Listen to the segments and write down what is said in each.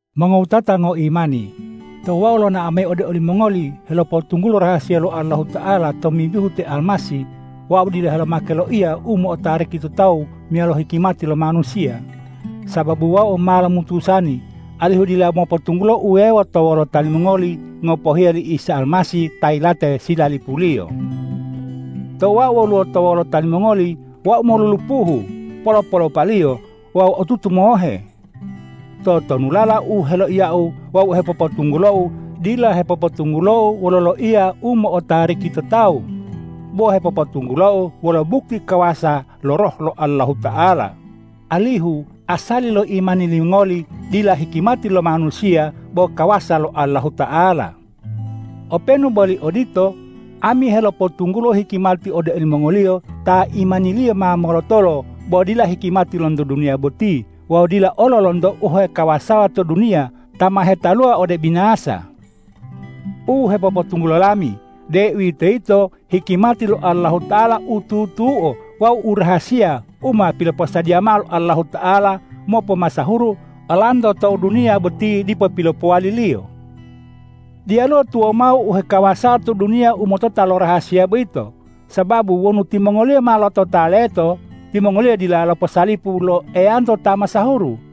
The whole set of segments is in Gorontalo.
Mongowutata ngoimani! Tou wau lonao mayi ode olimongoli helopotunggulo rahasiya lo Allahuta'ala tomimbihu te Almasih, wau dila helomake loiya u mo'otariki to tawu meyalo hikimati lo manusiya. Sababu wau ma lomutusani alihu dila mopotunggulo uwewo to wolota limongoli ngopohiya li Isa Almasih ta yilate silalipuliyo. Tou wau woluwo to wolota limongoli, wau molulupuhu, polo-polopaliyo wawu otutu mohe. Totonulala u heloiyau wawu u hepopotunggulou dila hepopotunggulou wolo loiya u mo'otariki to tawu, bo hepopotunggulou wolo bukti kawasa lo Roh lo Allahuta'ala, alihu asali lo imani limongoli dila hikimati lo manusiya bo kawasa lo Allahuta'ala. Openu boli odito, ami helopotunggulo hikimati ode olimongoliyo ta imaniliyo ma molotolo bo dila hikimati lonto duniya boti wawu dila olo lonto u hekawasawa to duniya ta ma hetaluwa ode ubinasa. U hepopotunggulo lami, deuwitoyito hikimati lo Allahuta'ala u tutuo wawu u rahasiya u ma piloposadiya mao lo Allahuta'ala mopomasahuru olanto tou duniya boti dipo pilopowali-Liyo. Diyaluwo tuwawu mao u hekawasawa to duniya u motota lo rahasiya boyito, sababu wonu timongoliyo motota leto, timongoliyo dila loposalipu lo Eyanto ta masahuru.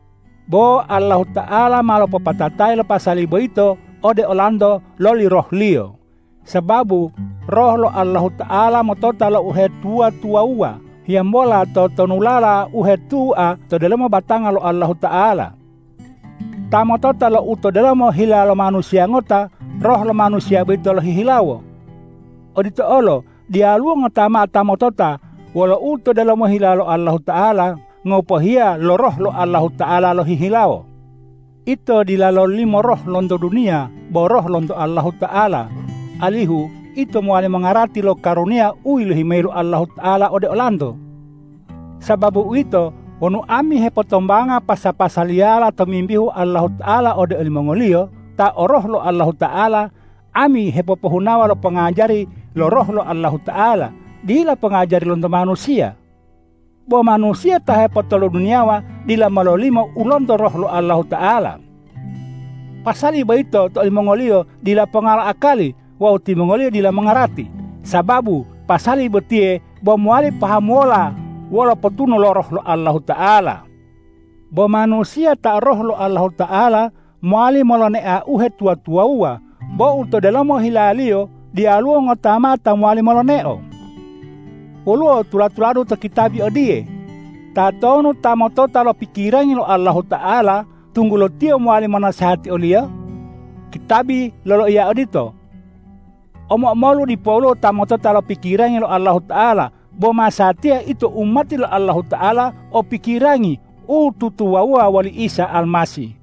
Bo Allahuta'ala ma lopopatatayi lo pasali boyito ode olanto loli Roh-Liyo, sababu Roh lo Allahuta'ala motota lo uhetuwa-tuwawuwa hiyambola totonulala u hetua to delomo batanga lo Allahuta'ala. Ta motota lo u to delomo hila lo manusiya ngota, roh lo manusiya boyito lohihilawo. Odito olo diyaluwo ngota mao ta motota wolo u to delomo hila lo Allahuta'ala, ngopohiya lo Roh lo Allahuta'ala lohihilawo. Ito dila lololimo roh lonto duniya bo Roh lonto Allahuta'ala, alihu ito mowali mongarati lo karuniya u yilohi mayi lo Allahuta'ala ode olanto. Sababu uwito, wonu ami hepotombanga pasa-pasaliyala tomimbihu Allahuta'ala ode olimongoliyo ta o Roh lo Allahuta'ala, ami hepopohunawa lo pongajari lo Roh lo Allahuta'ala, dila pongajari lonto manusiya. Bo manusiya ta hepotoloduniyawa dila mololimo u lonto Roh lo Allahuta'ala. Pasali boyito to olimongoliyo dila ponga lo akali wawu timongoliyo dila mongarati, sababu pasali botiye bo mowali pahamuwola wolo potunu lo Roh lo Allahuta'ala. Bo manusiya ta o Roh lo Allahuta'ala mowali molonea uhetuwa-tuwawuwa, bo u to delomo hilaliyo diyaluwo ngota mao ta mowali moloneo. Woluwo tula-tuladu to kitabi odiye,”Tatonu ta motota lo pikirangi lo Allahuta'ala, tunggulo tiyo mowali monasehati o-Liyo?” Kitabi loloiya odito. Omo-omolu dipoluwo ta motota lo pikirangi lo Allahuta'ala, bo masatiya ito umati lo Allahuta'ala o pikirangi u tutuwawuwa woli Isa Almasih.